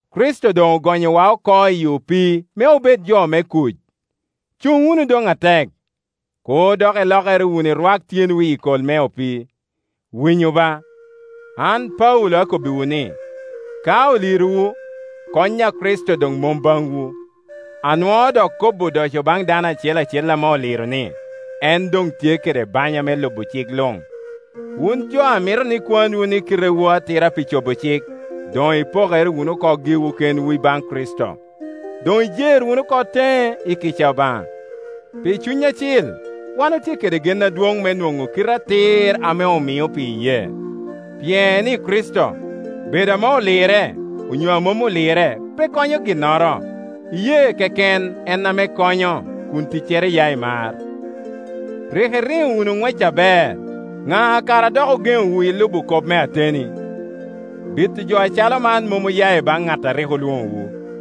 Kricito doŋ ogonyowa oko i opii me obed jo me kuc. Cuŋ wunu doŋ atek; kur dok ilokere wunu irwak tyenwu i kol me opii. Winyu ba, an Paulo akobbiwu ni, ka olirowu, kony a Kricito doŋ mom baŋwu. Anwoo dok kobo odoco baŋ dano acel acel ame olirre ni, en doŋ tye kede banya me lubo cik luŋ. Wun jo a mito ni kwanwu ni kitewu atira pi cobo cik, doŋ ipokere wunu oko giwu kenwu ibaŋ Kricito, doŋ ijer wunu oko teŋe i kica Obaŋa. Pi Cuny Acil wan otye kede gen adwoŋ me nwoŋo kite atir ame omio pi iyee. Pien i Kricito, bedo ame olirre onyo a mom olirre pe konyo ginnoro; iyee keken en ame konyo, kun ticcere ya i mar. Rik iriŋo wunu ŋwec aber; ŋa kara a dok ogeŋowu i lubo kop me ateni? Bito jo acalo man mom oya i baŋ ŋat a rik olwoŋowu.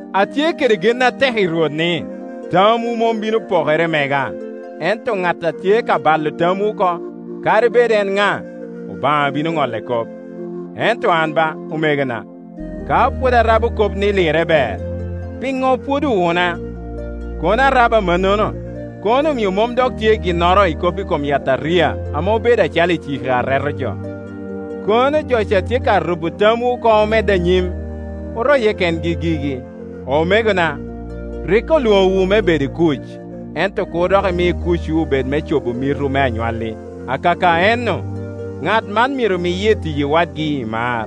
Atye kede gen atek i Rwot ni, tamwu mom bino pokere i mega; ento ŋat a tye ka balo tamwu oko, kadi bed en ŋa, Obaŋa bino ŋolle kop. Ento an ba, omegona, ka pwod arabo kop ni lirre ber, piŋo pwod owuna? Kono arabo amannono, kono omio mom dok tye ginnoro i kop i kom yataria ame obedo acalo iciki a reto joo Kono jo ca tye ka rubo tamwu oko omedde anyim, oroye kengi gigi! Omegona, rik olwoŋowu me bedo i kuc; ento kur dok imi kucwu obed me cobo mitwu me anywalli. Akaka ennu, ŋat man myero miye i tiyi wadgi i mar.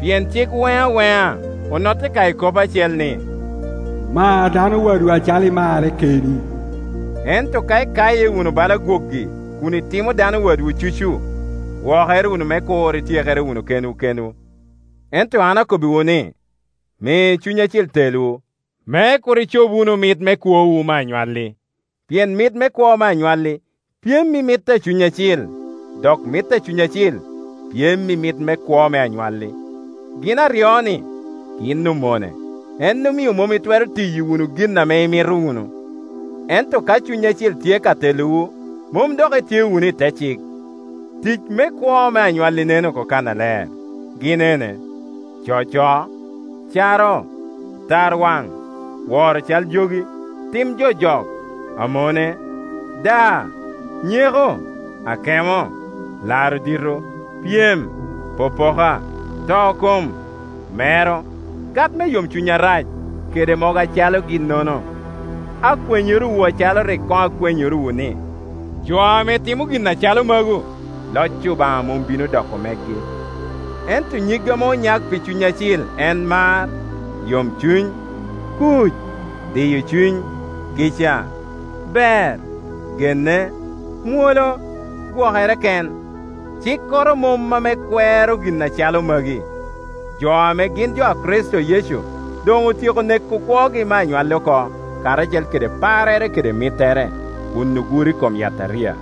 Pien cik weŋ aweŋa onotte ka i kop acel, ni, “Mar dano wadwu acalo imarre keni.” Ento ka ikaye wunu bala gwogi, kun itimo dano wadwu cucu, gwokere wunu me kur ityekere wunu kenwu kenwu. Ento an akobbiwu ni, mi Cuny Acil telwu, me kur icob wunu mit me kwowu me anywalli. Pien mit me kwo me anywalli pyem i mit a Cuny Acil, dok mit a Cuny Acil pyem i mit me kwo me anywalli. Gin aryo-ni gin omone, en omio mom itwero tiyo wunu gin ame imito wunu. Ento ka Cuny Acil tye ka telowu, mom dok itye wunu i te cik. Tic me kwo me anywalli nen oko kannaler; gin ene: coco, caro, tarwaŋ, woro cal jogi, tim jojok, amone, daa, nyeko akemo, laro dito, pyem, popoka, to kom, mero, gat me yomcuny arac, kede mogo acalo ginnono. Akwenyorowu acalo rik koŋ akwenyorowu ni, jo ame timo gin acalo magu, loc Obaŋa mom bino doko megi. Ento nyig ame onyak pi Cuny Acil en mar, yomcuny, kuc, diyo cuny, kica, ber, genne, mwolo, gwokere ken; cikkoro mom ame kwero gin acalo magi. Jo ame gin jo a Kricito Yecu doŋ otyeko neko kwogi me anywalli oko, karacel kede parrere kede mittere, kun oguro i kom yataria.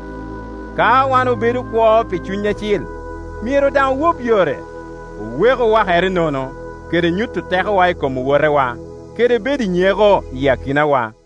Ka wan obedo kwo pi Cuny Acil, myero daŋ owop yore. Oweku wakere nono, kede nyuto tekowa i kom owotewa, kede bedo i nyeko i akinawa.